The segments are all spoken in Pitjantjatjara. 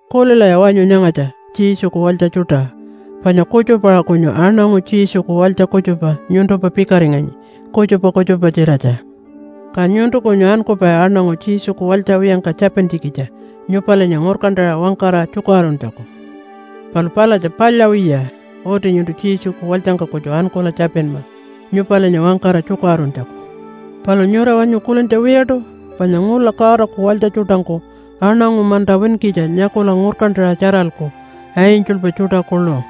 Kulilaya wanyu nyangatja, Jesuku walytja tjuṯa. Panya kutjupa-aṟa kunyu aṉangu Jesuku walytja kutjupa nyuntumpa pikaringanyi kutjupa kutjupa-tjiratja. Ka nyuntu kunyu ankupai aṉangu Jesuku walytja wiyangka tjapintjikitja nyupalinya ngurkantaṟa wangkara tjukaṟuruntjaku. Palu palatja palya wiya. Uti nyuntu Jesuku walytjangka kutju ankula tjapinma nyupalinya wangkara tjukaṟuruntjaku. Palu nyura wanyu kulintja wiyaṯu? Panya ngula Godaku walytja tjuṯangku aṉangu manta winkitja nyakula ngurkantaṟa tjaralku, angelpa tjuṯa kuḻu.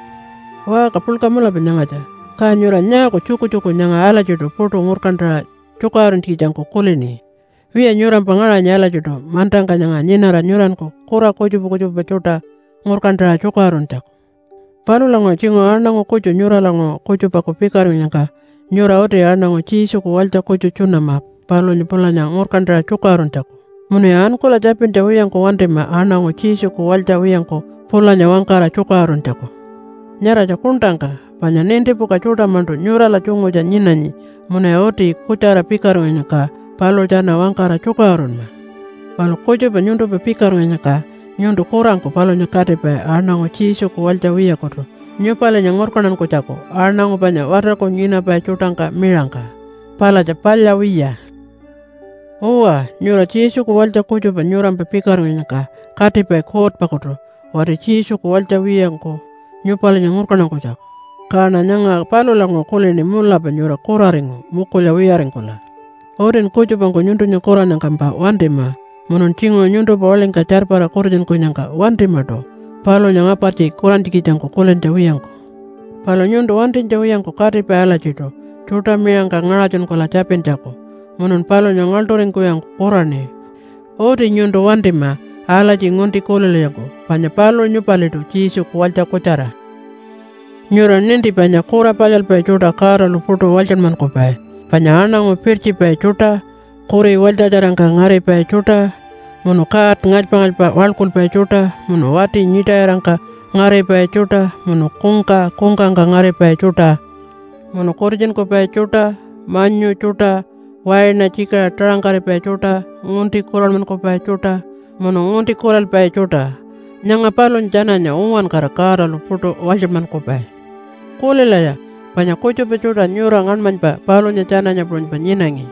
Waṟka puḻka mulapa nyangatja, ka nyura nyaaku tjukutjuku nyanga alatjiṯu puṯu ngurkantaṟa tjukaṟuruntjikitjangku kulini? Wiya nyurampa ngaṟanyi alatjiṯu mantangka nyanga nyinara nyuranku kura kutjupa kutjupa tjuṯa ngurkantaṟa tjukaṟuruntjaku. Palulanguṟu tjinguṟu aṉangu kutju nyuralanguṟu kutjupaku pikaringkunyangka nyura uti aṉangu Jesuku walytja kutju tjunama palunya pulanya ngurkantaṟa tjukaṟuruntjaku. Munuya ankula tjapintja wiyangku wantima aṉangu Jesuku walytja wiyangku pulanya wangkara tjukaṟuruntjaku. Nyaratja kuṉṯangka. Panya nintipuka tjuṯa-maṉṯu nyurala tjungutja nyinanyi munuya uti kutjara pikaringkunyangka paluṟu tjana wangkara tjukaṟurunma. Palu kutjupa nyuntumpa pikaringkunyangka nyuntu kurangku palunya katipai aṉangu Jesuku walytja wiyakutu nyupalinya ngurkantankunytjaku aṉangu panya watarku nyinapai tjuṯangka miṟangka? Palatja palya wiya. Uwa, nyura Jesuku walytja kutjupa nyurampa pikaringkunyangka katipai kuutpakutu wati Jesuku walytja wiyangku nyupalinya ngurkantankunytjaku. Kaṉa nyanga palulanguṟu kulini mulapa nyura kuraringu mukulya wiyaringkula. Utin kutjupangku nyuntunya kurannyangkampa wantima munun tjinguṟu nyuntumpa waḻingka tjarpara kutitjunkunyangka wantimaṯu palunya ngapartji kurantjikitjangku kulintja wiyangku. Palu nyuntu wantinytja wiyangku katipai alatjiṯu tjuṯa miṟangka ngaṟatjunkula tjapintjaku munun palunya ngaḻṯuringkuwiyangku kuraṉi. Uti nyuntu wantima alatji ngunti kulilwiyangku panya paluṟu nyupaliṯu Jesuku walytja kutjara. Nyura ninti panya kura palyalpai tjuṯa Godalu puṯu walytjanmankupai, panya aṉangu pirtjipai tjuṯa, kuri walytjatjarangka ngaripai tjuṯa, munu god ngalypa-ngalypa waḻkulpai tjuṯa, munu wati nyiṯayirangka ngaripai tjuṯa, munu kungka kungkangka ngaripai tjuṯa, munu kutitjunkupai tjuṯa, manyu tjuṯa, waina tjikiṟa taṟangkaripai tjuṯa, ngunti kuranmankupai tjuṯa, munu ngunti kuralpai tjuṯa, nyanga palunya tjananya uwankara Godalu puṯu walytjanmankupai. Kulilaya, panya kutjupa tjuṯa nyura ngaṉmanypa palunya tjananya puṟunypa nyinangi.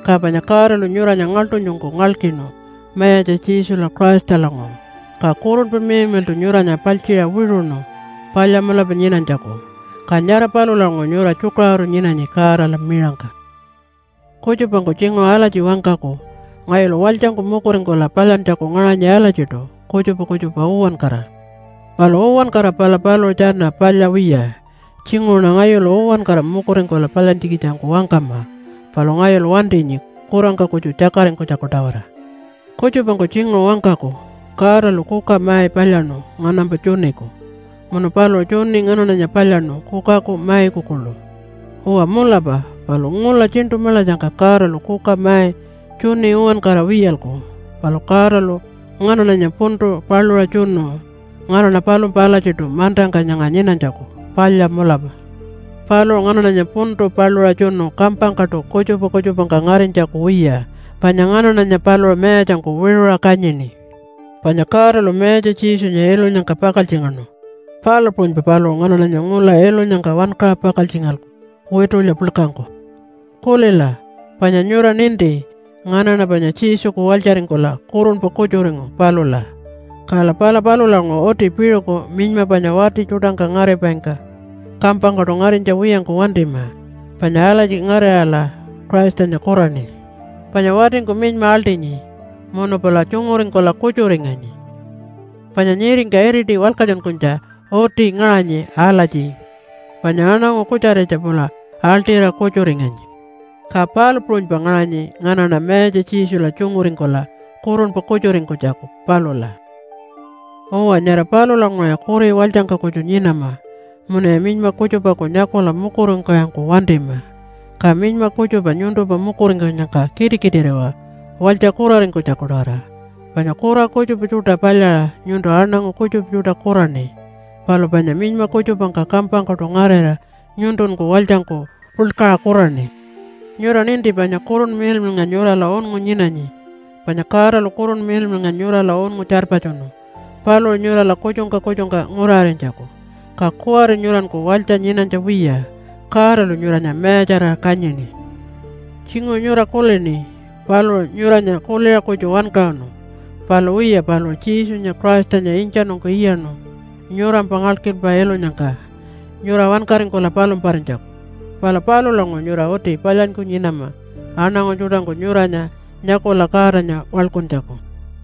Ka panya Godalu nyuranya ngaḻṯunytjungku ngalkinu Mayatja Jesula Christalanguṟu, ka Kurunpa Miḻmiḻṯu nyuranya paltjiṟa wiṟuṉu palya mulapa nyinanytjaku. Ka nyara palulanguṟu nyura tjukaṟuru nyinanyi Godala miṟangka. Kutjupangku tjinguṟu alatji wangkaku, “Ngayulu walytjangku mukuringkula palyantjaku ngaṟanyi alatjiṯu, kutjupa kutjupa uwankara.” Palu uwankara pala paluṟu tjana palya wiya. Tjinguṟuṉa ngayulu uwankara mukuringkula palyantjikitjangku wangkama, palu ngayulu wantinyi kurangka kutju tjakaringkunytjaku-tawara. Kutjupangku tjinguṟu wangkaku, “Godalu kuka mai palyaṉu nganampa tjuniku, munu paluṟu tjuni nganaṉanya palyaṉu kukaku maiku kuḻu.” Uwa mulapa, palu ngula tjiṉṯu maḻatjangka Godalu kuka mai tjuni uwankara wiyalku. Palu Godalu nganaṉanya puntu paluṟa tjunu nganaṉa palumpa alatjiṯu mantangka nyanga nyinanytjaku, palya mulapa. Paluṟu nganaṉanya puntu paluṟa tjunu kampangkaṯu kutjupa kutjupangka ngarinytjaku wiya. Panya nganaṉanya paluṟu mayatjangku wiṟuṟa kanyini. Panya Godalu Mayatja Jesunya ilunyangka pakaltjingaṉu, palu puṟunypa paluṟu nganaṉanya ngula ilunyangka wankaṟa pakaltjingalku witulya puḻkangku. Kulila, panya nyura ninti nganaṉa panya Jesuku walytjaringkula kurunpa kutjuringu palula. Kala pala palulanguṟu uti piṟuku minyma panya wati tjuṯangka ngaripaingka kampangkaṯu ngarinytja wiyangku wantima. Panya alatji ngarirala Christanya kuraṉi. Panya watingku minyma aḻṯinyi munu pula tjunguringkula kutjuringanyi. Panya nyiringka iriti walkatjunkunytja uti ngaṟanyi alatji, “Panya aṉangu kutjaritja pula aḻṯira kutjuringanyi.” Ka palu puṟunypa ngaṟanyi nganaṉa Mayatja Jesula tjunguringkula kurunpa kutjuringkunytjaku palula. Uwa, nyara palulanguṟuya kuri walytjangka kutju nyinama munuya minyma kutjupaku nyakula mukuringkuwiyangku wantima. Ka minyma kutjupa nyuntumpa mukuringkunyangka kitikitiriwa walytja kuraringkunytjaku-tawara. Panya kura kutjupa tjuṯa palyaṟa nyuntu aṉangu kutjupa tjuṯa kuraṉi, palu panya minyma kutjupangka kampangkaṯu ngarira nyuntunku walytjangku puḻkaṟa kuraṉi. Nyura ninti panya Kurunpa Miḻmiḻnga nyurala unngu nyinanyi. Panya Godalu Kurunpa Miḻmiḻnga nyurala unngu tjarpatjunu paluṟu nyurala kutjungka kutjungka nguraṟarinytjaku. Ka kuwari nyuranku walytja nyinanytja wiya, Godalu nyuranya mayatjarira kanyini. Tjinguṟu nyura kulini paluṟu nyuranya kuliṟa kutju wankaṟunu. Palu wiya paluṟu Jesunya Christanya intjanungku iyaṉu nyurampa ngalkilpa ilunyangka nyura wankaringkula palumparinytjaku. Pala palulanguṟu nyura uti palyanyku nyinama aṉangu tjuṯangku nyuranya nyakula Godanya waḻkuntjaku.